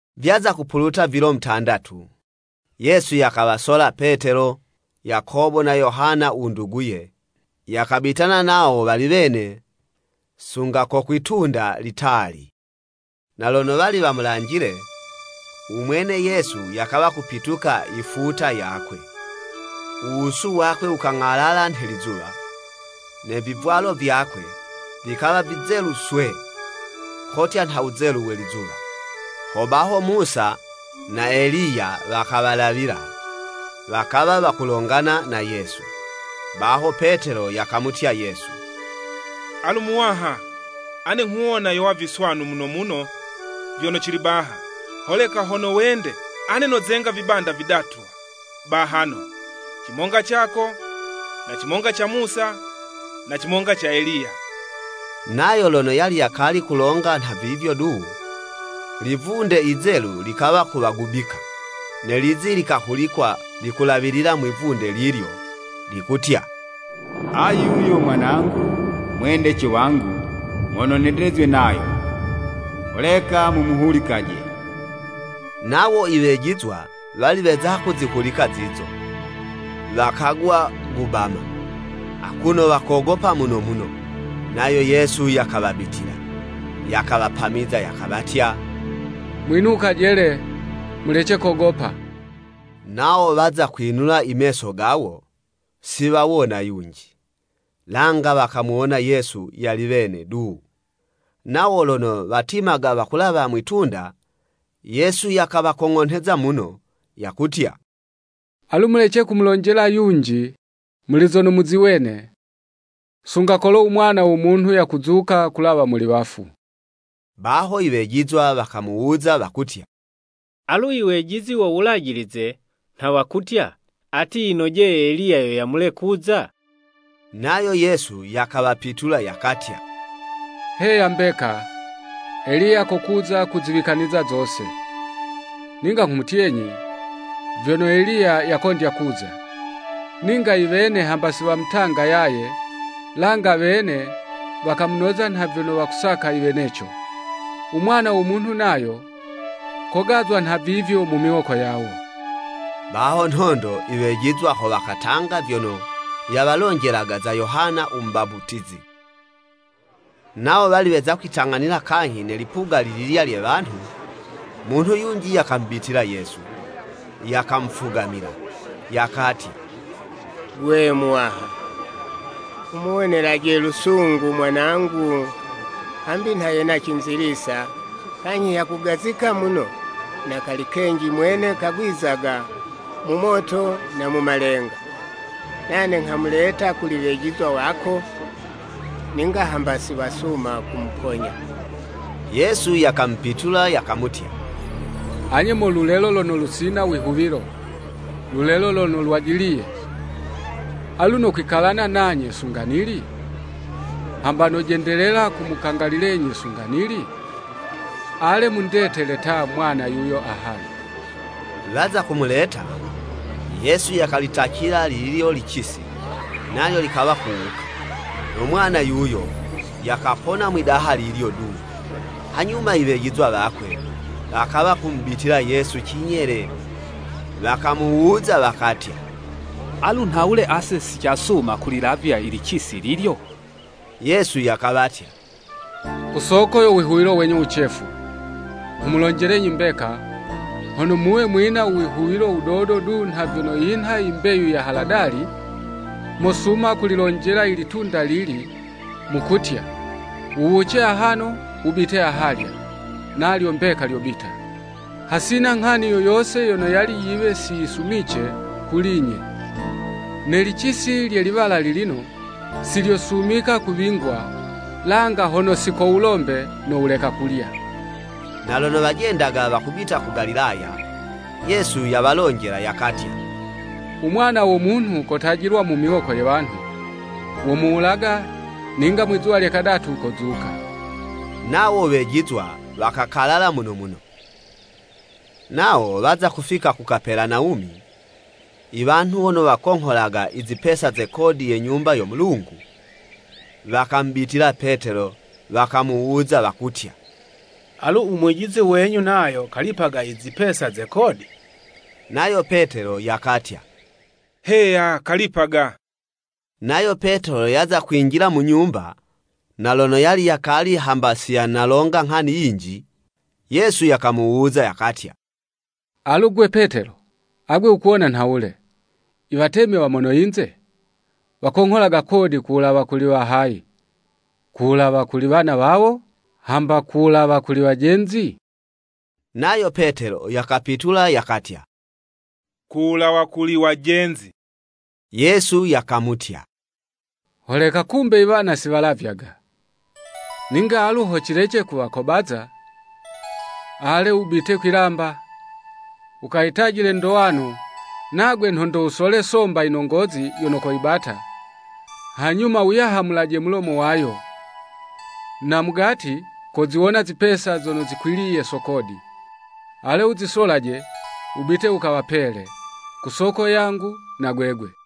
Vyaza kupuluta vilo mutandatu, Yesu yakawasola Petelo, Yakobo na Yohana u nduguye, yakabitana nawo wali wene sunga ko kwi'tunda litali. Na lono wali wamulanjile, u mwene Yesu yakawa kupituka i futa yakwe, u wusu wakwe wukang'alala nhe lizuwa, ne vivwalo vyakwe, vikawa vizelu swee, kotya nha wuzelu we lizuwa. Hobaho Musa na Eliya wakawalawila, wakawa wakulongana na Yesu. Baho Petelo yakamutya Yesu, “Alu Muwaha, ane nghuwona yowa viswanu muno muno vyono cili baha, Holeka hono wende, ane nozenga vibanda vidatu bahano, cimonga cako, na cimonga ca Musa, na cimonga ca Eliya.” Nayo lono yali yakali kulonga nha vivyo du, livunde yizelu likawa kuwagubika, ne lizi likahulikwa likulawilila mwi'vunde lilyo, likutya, “Ayu yo Mwanangu, u mwendece wangu, mono nyendezwe nayo, holeka mumuhulikaje.” Nawo i wejizwa wali weza kuzihulika zizo, wakagwa gubama, akuno wakogopa muno muno. Nayo Yesu yakawabitila, yakawapamiza yakawatya, “Mwinukaje le, mulece kogopa!” Nawo waza kwinula i meso gawo, si wawona yunji, langa wakamuwona Yesu yali wene du. Nawo lono watimaga wakulawa mwitunda, Yesu yakawakong'onheza muno, yakutya, “Alu, mulece kumulonjela yunji muli zono muziwene, sunga kolo u Mwana wo Munhu yakuzuka kulawa muli wafu.” Baho i wejizwa wakamuwuza wakutya, “Alu i wejizi wo Wulajilize nha wakutya, ati yinojeye Eliya yo yamule kuza?” Nayo Yesu yakawapitula yakatya, “Heya mbeka, Eliya kokuza kuziwikaniza zose. “Ninga nghumutyenyi, vyono Eliya yakondya kuza, ninga iwene hamba si wamutanga yaye, langa wene wakamunoza nha vyono wasakaga iweneco. U Mwana wo Munhu nayo, kogazwa nha vivyo mu miwoko yawo.” Baho nhondo i wejizwa ho wakatanga vyono yawalonjelaga za Yohana u Mubaputizi. Nawo wali weza kwitang'anila kanyhi ne lipuga lililya lye wanhu, munhu yunji yakamubitila Yesu, yakamufugamila, yakatya, “Gwe Muwaha, wumuwonelaje lusungu mwanangu, hambi nha yena cinzilisa, kanyhi yakugazika muno, na kali kenji mwene kagwizaga mu moto na mu malenga. Nane nghamuleta kuli wejizwa wako, ninga hamba si wasuma kumuponya.” Yesu yakamupitula yakamutya, “Anye mo lulelo lono lusina u wihuwilo, lulelo lono lwajiliye! Alu nokwikalana nanye sunga nili? Hamba nojendelela kumukangalililenyi sunga nili? Ale mundetele ta umwana yuyo ahano.” Waza kumuleta, Yesu yakalitacila lilyo licisi, nalyo likawa kuwuka, no mwana yuyo, yakapona mwidaha lilyo du. Hanyuma iwejizwa wakwe, wakawa kumubitila Yesu cinyele wakamuwuza wakatya, “Alu nhawule ase si casuma kulilavya i licisi lilyo?” Yesu yakawatya, “Ku soko yo wihuwilo wenyu wucefu. Nghumulonjelenyi mbeka, hono muwe mwina u wihuwilo wudodo du nha vyono yinha yi mbeyu ya haladali, mosuma kulilonjela i litunda lili, mukutya, ‘Wuwuce ahano, wubite ahalya,’ nalyo mbeka lyobita. Hasina nghani yo yose yono yali yiwe si yisumice kuli'nye. [ Ne licisi lye liwala lilino, si lyosumika kuwingwa, langa hono si ko wulombe no wuleka kulya.]” Na lono wajendaga wakubita ku Galilaya, Yesu yawalonjela yakatya, “U Mwana wo Munhu kotajilwa mu miwoko ye wanhu. Womuwulaga, ninga mwi'zuwa lye kadatu, kozuka.” Nawo wejizwa wakakalala muno muno. Nawo waza kufika ku Kapelanawumi, iwanhu wono wakongholaga izipesa ze kodi ye Nyumba yo Mulungu, wakamubitila Petelo wakamuwuza wakutya, “Alu u Mwijizi wenyu nayo kalipaga izipesa ze kodi?” Nayo Petelo yakatya. “Heya kalipaga.” Nayo Petelo yaza kwinjila mu nyumba, na lono yali yakali hamba si yanalonga nghani yinji, Yesu yakamuwuza, yakatya, “Alu, 'gwe Petelo, agwe wukuwona nhawule? Iwatemi wa mono yinze, wakongholaga kodi ku wulawa kuli wa hayi? Ku wulawa kuli iwana wawo, hamba ku wulawa kuli iwajenzi?” Nayo Petelo yakapitula yakatya, “Kuwulawa kuli wajenzi.” Yesu yakamutya, “Holeka kumbe iwana si walavyaga. Ninga alu ho cilece kuwakobaza, ale wubite kwi'lamba, wukayitajile ndowano, nagwe nhondo wusole somba yinongozi yono koyibata, hanyuma wuyahamulaje mulomo wayo, na mugati koziwona zipesa zono zikwiliye so kodi. Ale wuzisolaje wubite wukawapele, ku soko yangu na gwegwe!”